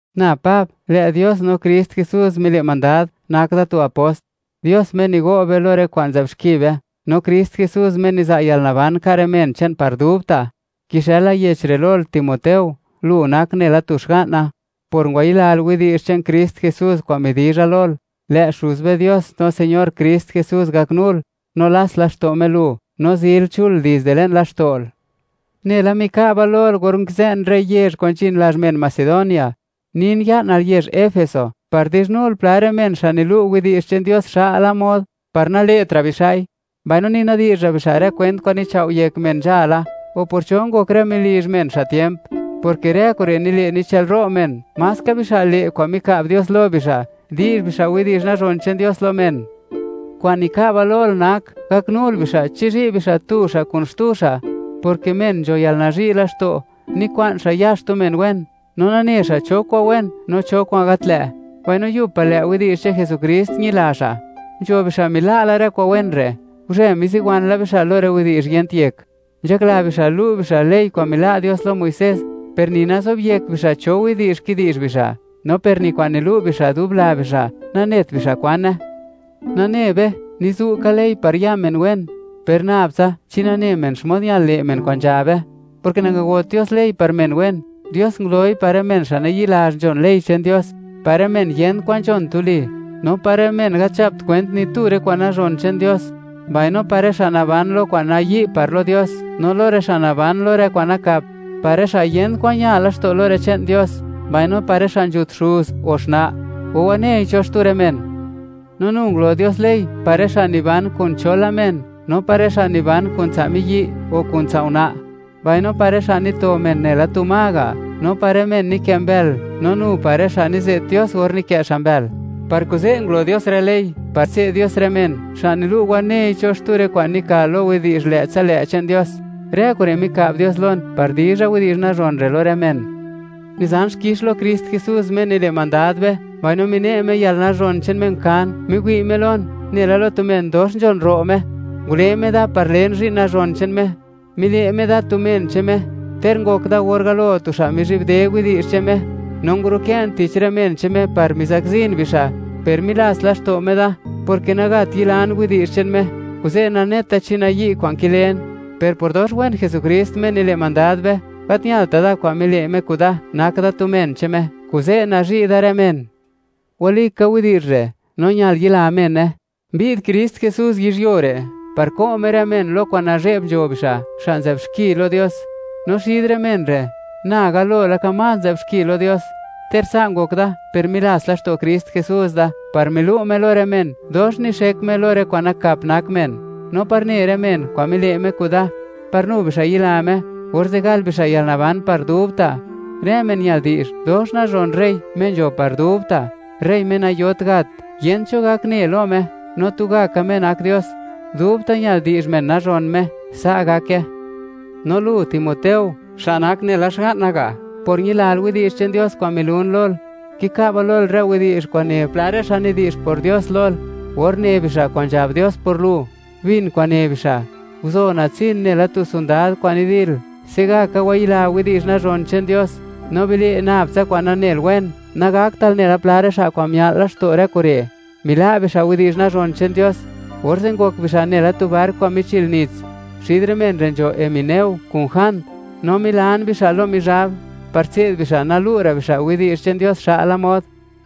Na Pab, lë' Dios no Krist Jesús mile' mandad, nak da tu apost; Dios Me nigo' be lo rë kwa'n nzë'b xki be; no Krist Jesús, Me niza' yalnaban ka' rë men che'n par dubta'. Kixëla yech re' lol, Timoteo, lu nak nela tu xga'na, por ngwayilal widi'zh che'n Krist Jesús kwa'n midizha lol; lë' Xuz be Dios no Señor Krist Jesús gaknul, no lats laxto' Me lu, no zil chul dizde le'n laxto'l. Nela mika'ba lol or nkizë'n rë yezh kwa'n nzhin lazh men Macedonia, nin ya'nal yezh Efeso par di'zhnul pla rë men xa' nilu' widi'zh che'n Dios xa'la mod, par nale'tra' bixa'i, mbaino ni nadi'zh ra' bixa' rë kwent kwa'n michao'yek men nzhala, o por cho ngok rë melizh men xa' tiemp; porke rë kure' nile' nichë'lro' men maska bixa' le' kwa'n mika'b Dios lo bixa', di'zh bixa' widi'zh nazhon che'n Dios lo men. Kwa'n mika'ba lol nak gaknul bixa' chizhi' bixa' tu xa' kun xtu xa', porke men nzho yalnazhi' laxto', nikwa'n xa' ya xtu men wen, no nane xa' cho kwa'n wen no cho kwa'n gat lë', mbaino yub pa' lë' widi'zh che'n Jesukrist ñila xa'. Nzho bixa' mila' la rë kwa'n wen re'; guzhe miziwan bixa' lo rë widi'zh yent yek. Nzhakla bixa' lu' bixa' ley kwa'n mila' Dios lo Muisés, per ni nazobyek bixa' cho widi'zh kidi'zh bixa'; no per ni kwa'n nilu' bixa' dub la bixa', nanet bixa' kwane. Nane be, nizu' ka ley par ya men wen, per nab tsa chi nane men xmod ñal le' men kwa'n nzhabe, porke nangagot Dios ley par men wen; Dios nguloi par rë men xa' nayi'lazh nzhon ley che'n Dios, par rë men yent kwan nzhon tuli, no par rë men gat nzhapt kwent ni tu rë kwa'n nazhon che'n Dios; mbaino par rë xa' naban lo kwa'n nayi' par lo Dios no lo rë xa' naban lo rë kwa'n nakap; par rë xa' yent kwan ña laxto' lo rë che'n Dios, mbaino par rë xa' nzhut xuz o xna', o wanei cho xtu rë men. No nu ngulo Dios ley par rë xa' niban kun cho la men no par rë xa' niban kun tsa' miyi' o kun tsa' una', mbaino par rë xa' nito men nela tu ma ga', no par rë men nikë' mbël no nu par rë xa' nize't Dios or nikë' xa' mbël. Par kuze' ngulo Dios rë ley par tse'd Dios rë men xa' nilu' wanei cho xtu rë kwa'n nika lo widi'zh lë'tsa lë' che'n Dios. Rë kure' mika'b Dios lon par dizha widi'zh nazhon re' lo rë men. Nizan xkix lo Krist Jesús, Me nile' mandad be, mbaino mine' Me yalnazhon che'n Me kan, miwi' Me lon, nela lo tu men dox nzhon ro' Me, ngule Me da par len zhi'n nazhon che'n Me. Mile' Me da tu men che'n Me, ter ngok da or galo tu xa' mizhibde widi'zh che'n Me, no ngurukë'n tich rë men che'n Me par mizakzin bixa'; per milats laxto' Me da, porke nagat yilan widi'zh che'n Me, kuze' naneta chi nayi' kwa'n kilen. Per por dox wen Jesukrist, Me nile' mandad be, gat ñalta' da kwa'n mile' Me kuda, nak da tu men che'n Me, kuze' nazhi' da rë men. Walika widi'zh re', no ñal yila mene: Mbi'd Krist Jesús yizhyuo re' par ko' Me rë men lo kwa'n nazhe'b nzho bixa', xa' nzë'b xki lo Dios; no xid rë men re', na galo laka más nzë'b xki lo Dios. Ter sa' ngok da, per milats laxto' Krist Jesús da par milu' Me lo rë men, dox nixek Me lo rë kwa'n nakap nak men, no par ne rë men kwa'n mile' Me kuda, par nu bixa' yila Me, orze' gal bixa' yalnaban par dubta'. Rë men ñal di'zh nazhon rey Me nzho par dubta', rey Me nayot gat. Yent cho gak ne lo Me, no tugaka Me nak Dios. Dubta' ñal di'zh men dox nazhon Me. ¡Sa' gake! No lu, Timoteo, xa' nak nela xga'na ga' por ñilal widi'zh che'n Dios kwa'n milun lol; kika'ba lol rë widi'zh kwa'n ne pla rë xa' nidi'zh por Dios lol, or ne bixa' kwa'n nzhab Dios por lu. Bin kwa'n ne bixa', guzo natsin nela tu sondad kwa'n nidil. Se'gaka wayila widi'zh nazhon che'n Dios, no bile' nab tsa kwa'n nanel wen; nagaktal nela pla rë xa' kwa'n mia'l laxto' rë kure', mila' bixa' widi'zh nazhon che'n Dios; orze' ngok bixa' nela tu bark kwa'n michil nits. Xid rë men re' nzho Himeneo kun Jand, no milan bixa' lo Mizhab, par tse'd bixa' nalu' ra' bixa' widi'zh che'n Dios xa'la mod.